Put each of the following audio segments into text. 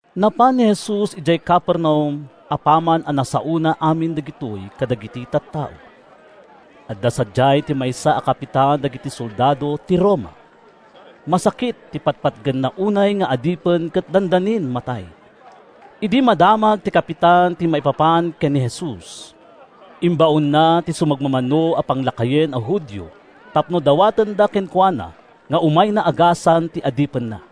Napan ni Jesus idiay Capernaum apaman a nasaona amin dagitoy kadagiti tattao. Adda sadiay ti maysa a kapitan dagiti soldado ti Roma. Masakit ti patpatgenna unay nga adipen ket dandanin matay. Idi madamag ti kapitan ti maipapan ken ni Jesus, imbaonna ti sumagmamano a panglakayen a Judio tapno dawatenda kenkuana nga umayna agasan ti adipenna.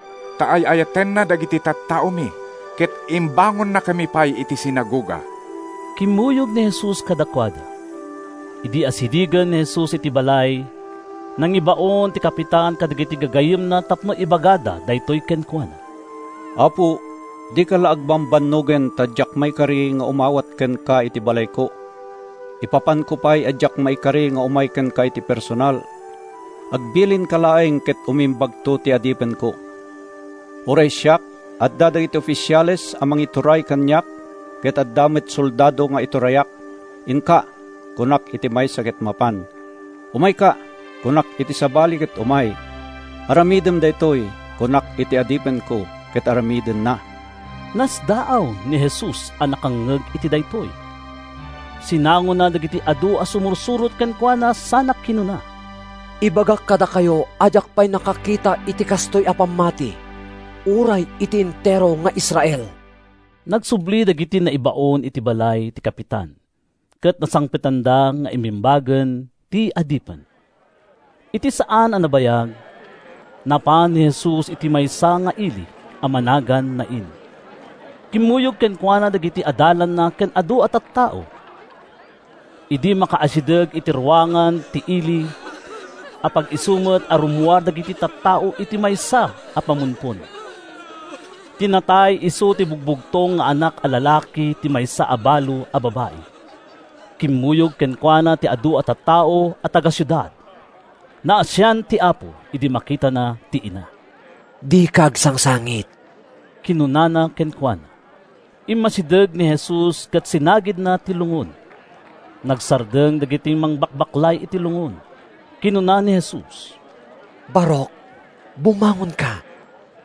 “ta ay-ayatenna dagiti tattaomi ket imbangonannakami pay iti sinagoga.” Kimmuyog ni Jesus kadakuada. Idi asidegen ni Jesus iti balay, nangibaon ti kapitan kadagiti gagayyemna tapno ibagada daytoy kenkuana: “Apo, dika la agbambannogen ta diak maikari nga umawat kenka iti balayko. Ipapanko pay a diak maikari nga umay kenka iti personal. Agbilinka laeng ket umimbagto ti adipenko. Uray siak, adda dagiti ofisiales a mangituray kaniak ket adda met soldado nga iturayak. ‘Inka,’ kunak iti maysa ket mapan. ‘Umayka,’ kunak iti sabali ket umay. ‘Aramidem daytoy,’ kunak iti adipenko ket aramidenna.” Nasdaaw ni Jesus a nakangngeg iti daytoy. Sinangona dagiti adu a sumursurot kenkuana sana kinuna: “Ibagak kadakayo a diak pay nakakita iti kastoy a pammati, uray iti entero nga Israel!” Nagsubli dagiti naibaon iti balay ti kapitan ket nasangpetanda nga immimbagen ti adipen. Iti saan a nabayag, napan ni Jesus iti maysa nga ili a managan Nain. Kimmuyog kenkuana dagiti adalanna ken adu a tattao. Idi makaasideg iti ruangan ti ili, apag-isu met a rummuar dagiti tattao iti maysa a pamumpon. Ti natay isu ti bugbugtong nga anak a lalaki ti maysa a balo a babai. Kimmuyog kenkuana ti adu a tattao a taga-siudad. Naasian ti Apo idi makitana ti ina. “Dika agsangsangit,” kinunana kenkuana. Immasideg ni Jesus ket sinagidna ti lungon. Nagsardeng dagiti mangbakbaklay iti lungon. Kinuna ni Jesus, “Barok, bumangonka!”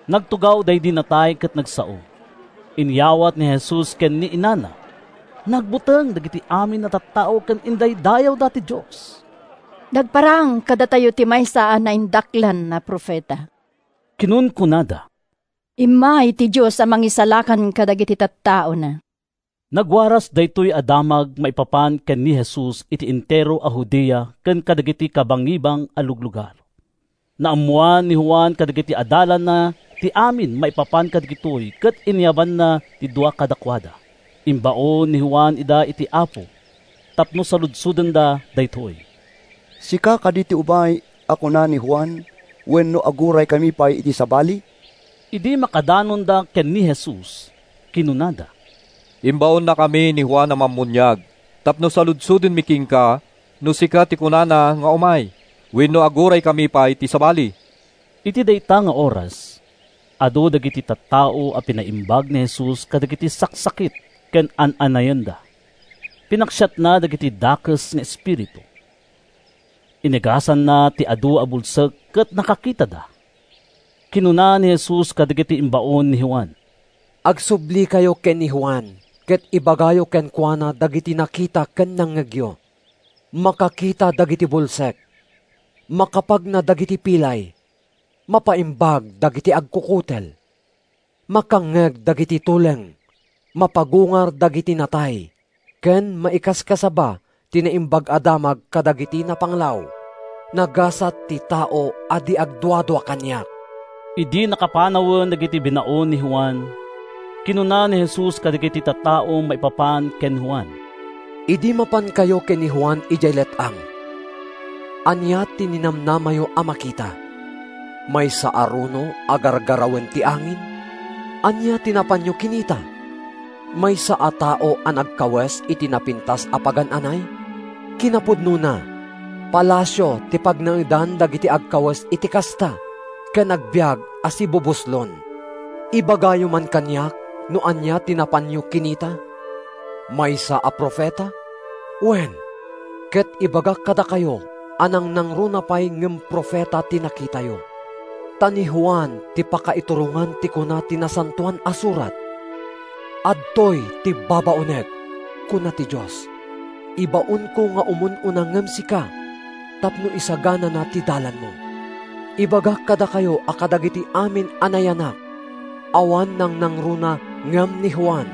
Nagtugaw daydi natay ket nagsao. Inyawat ni Jesus ken ni inana. Nagbuteng dagiti amin a tattao ket indaydayawda ti Dios. “Nagparang kadatayo ti maysa a naindaklan a profeta!” kinunkunada. “Immay ti Dios a mangisalakan kadagiti tattaona!” Nagwaras daytoy a damag maipapan ken ni Jesus iti entero a Judea ken kadagiti kabangibang a luglugar. Naammoan ni Juan kadagiti adalanna ti amin maipapan kadagitoy ket inayabanna ti dua kadakuada. Imbaon ni Juan ida iti Apo tapno saludsodenda daytoy, “Sika kadi ti umay a kuna ni Juan, wenno aguraykami pay iti sabali?” Idi makadanonda ken ni Jesus, kinunada, “Imbaonnakami ni Juan a Mammuniag tapno saludsodenmi kenka no sika ti kunana nga umay, wenno aguraykami pay iti sabali?” Iti dayta nga oras, adu dagiti tattao a pinaimbag ni Jesus kadagiti saksakit ken an-anayenda. Pinaksiatna dagiti dakes nga espiritu. Inagasanna ti adu a bulsek ket nakakitada. Kinuna ni Jesus kadagiti imbaon ni Juan, “Agsublikayo ken ni Juan ket ibagayo kenkuana dagiti nakita ken nangngegyo: makakita dagiti bulsek, makapagna dagiti pilay, mapaimbag dagiti agkukutel, makangngeg dagiti tuleng, mapagungar dagiti natay ken maikaskasaba ti Naimbag a Damag kadagiti napanglaw. Nagasat ti tao a di agduadua kaniak!” Idi nakapanawen dagiti binaon ni Juan, kinuna ni Jesus kadagiti tattao maipapan ken ni Juan: “Idi mapankayo ken ni Juan idiay let-ang, ania ti ninamnamayo a makita? Maysa a runo a gargarawen ti angin? Ania ti napanyo kinita? Maysa a tao a nagkawes iti napintas a pagan-anay? Kinapudnona, palasio ti pagnaedan dagiti agkawes iti kasta ken agbiag a sibubuslon! Ibagayo man kaniak no ania ti napanyo kinita? Maysa a profeta? Wen, ket ibagak kadakayo a nangnangruna pay ngem profeta ti nakitayo. Ta ni Juan ti pakaiturongan ti kuna ti Nasantoan a Surat: ‘Adtoy ti babaonek,’ kuna ti Dios; ‘ibaonko nga umun-una ngem sika tapno isaganana ti dalanmo.’ Ibagak kadakayo a kadagiti amin a nayanak, awan nangnangruna ngem ni Juan.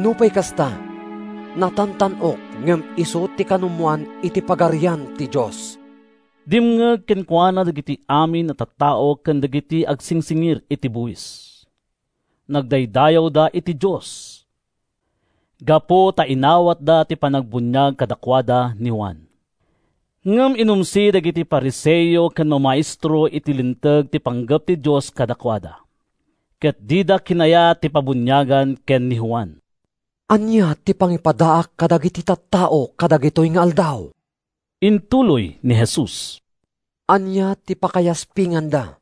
Nupay kasta, natantan-ok ngem isu ti kanumoan iti Pagarian ti Dios.” Dimngeg kenkuana dagiti amin a tattao ken dagiti agsingsingir iti buis. Nagdaydayawda iti Dios, gapu ta inawatda ti panangbuniag kadakuada ni Juan. Ngem inumsi dagiti Fariseo ken mamaestro iti Linteg ti panggep ti Dios kadakuada ket dida kinayat ti pabuniagan ken ni Juan. “Ania ti pangipadaak kadagiti tattao kadagitoy nga aldaw?” intuloy ni Jesus. “Ania ti pakayaspinganda?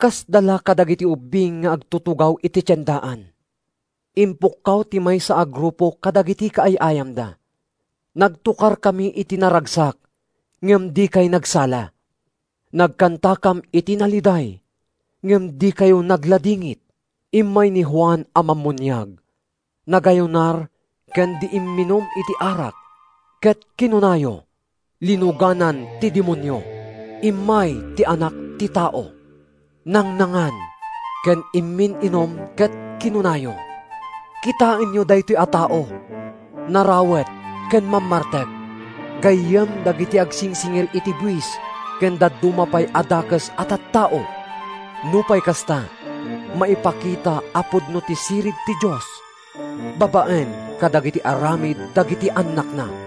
Kasda la kadagiti ubbing nga agtutugaw iti tiendaan. Ipukkaw ti maysa a grupo kadagiti kaay-ayamda, ‘Nagtokarkami iti naragsak, ngem dikay nagsala. Nagkantakam iti naliday, ngem dikayo nagladingit!’ Immay ni Juan a Mammuniag, nagayunar ken di imminum iti arak, ket kinunayo: ‘Linuganan ti demonio!’ Immay ti Anak ti Tao. Nangnangan ken immin-inum ket kinunayo: ‘Kitaenyo daytoy a tao! Narawet ken mammartek. Gayyem dagiti agsingsingir iti buis ken dadduma pay a dakes a tattao!’ Nupay kasta, maipakita a pudno ti sirib ti Dios babaen kadagiti aramid dagiti annakna.”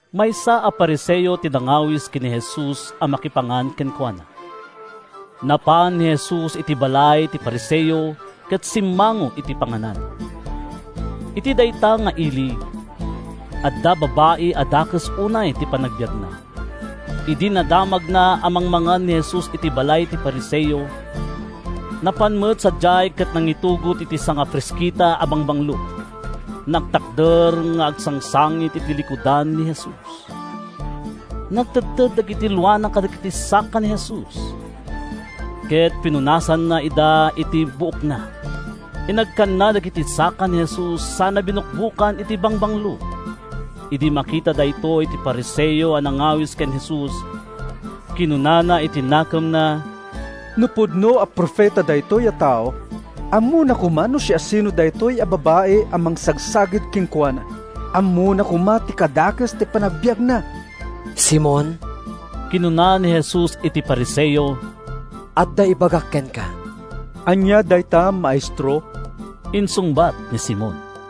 Maysa a Fariseo ti nangawis ken ni Jesus a makipangan kenkuana. Napan ni Jesus iti balay ti Fariseo ket simmango iti panganan. Iti dayta nga ili, adda babai a dakes unay ti panagbiagna. Idi nadamagna a mangmangan ni Jesus iti balay ti Fariseo, napan met sadiay ket nangitugot iti sangafraskita a bangbanglo. Nagtakder nga agsangsangit iti likudan ni Jesus. Nagtedted dagiti luana kadagiti saka ni Jesus, ket pinunasanna ida iti buokna. Inagkanna dagiti saka ni Jesus sana binukbokan iti bangbanglo. Idi makita daytoy ti Fariseo a nangawis ken Jesus, kinunana iti nakemna: “No pudno a profeta daytoy a tao, ammona koma no siasino daytoy a babai a mangsagsagid kenkuana. Ammona koma ti kadakes ti panagbiagna!” “Simon,” kinuna ni Jesus iti Fariseo, “adda ibagak kenka.” “Ania dayta, Maestro?” insungbat ni Simon.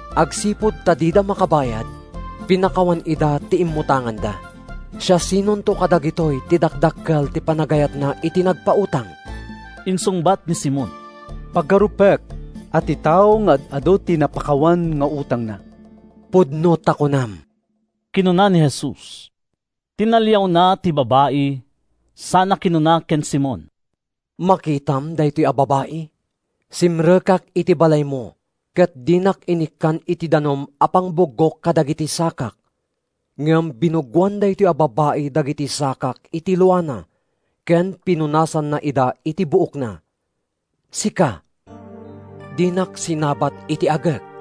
Agsipud ta dida makabayad, pinakawan ida ti immutanganda. Siasinonto kadagitoy ti dakdakkel ti panagayatna iti nagpautang?” Insungbat ni Simon, “Pagarupek a ti tao nga ad-adu ti napakawan nga utangna.” “Pudno ta kunam,” kinuna ni Jesus. Tinaliawna ti babai, sana kinuna ken Simon: “Makitam daytoy a babai? Simrekak iti balaymo ket dinak inikkan iti danum a pangbuggok kadagiti sakak, ngem binuggoan daytoy a babai dagiti sakak iti luana ken pinunasanna ida iti buokna. Sika, dinak sinabat iti agek.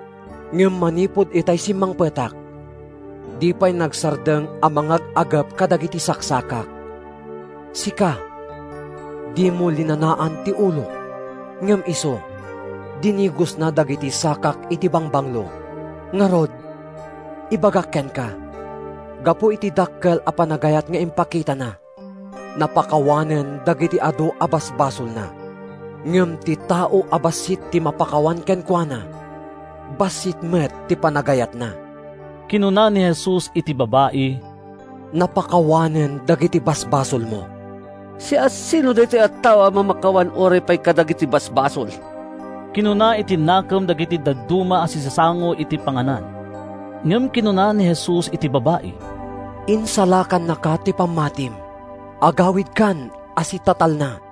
Ngem manipud itay simmangpetak, di pay nagsardeng a mangag-agep kadagiti saksakak. Sika, dimo linanaan ti ulok, ngem isu, dinigosna dagiti sakak iti bangbanglo. Ngarud, ibagak kenka, gapu iti dakkel a panagayat nga impakitana, napakawanen dagiti adu a basbasolna. Ngem ti tao a bassit ti mapakawan kenkuana, bassit met ti panagayatna.” Kinuna ni Jesus iti babai, “Napakawanen dagiti basbasolmo.” “Siasino daytoy a tao a mamakawan uray pay kadagiti basbasol?” kinuna iti nakem dagiti dadduma a sisasango iti panganan. Ngem kinuna ni Jesus iti babai, “Insalakannaka ti pammatim. Agawidkan a sitatalna.”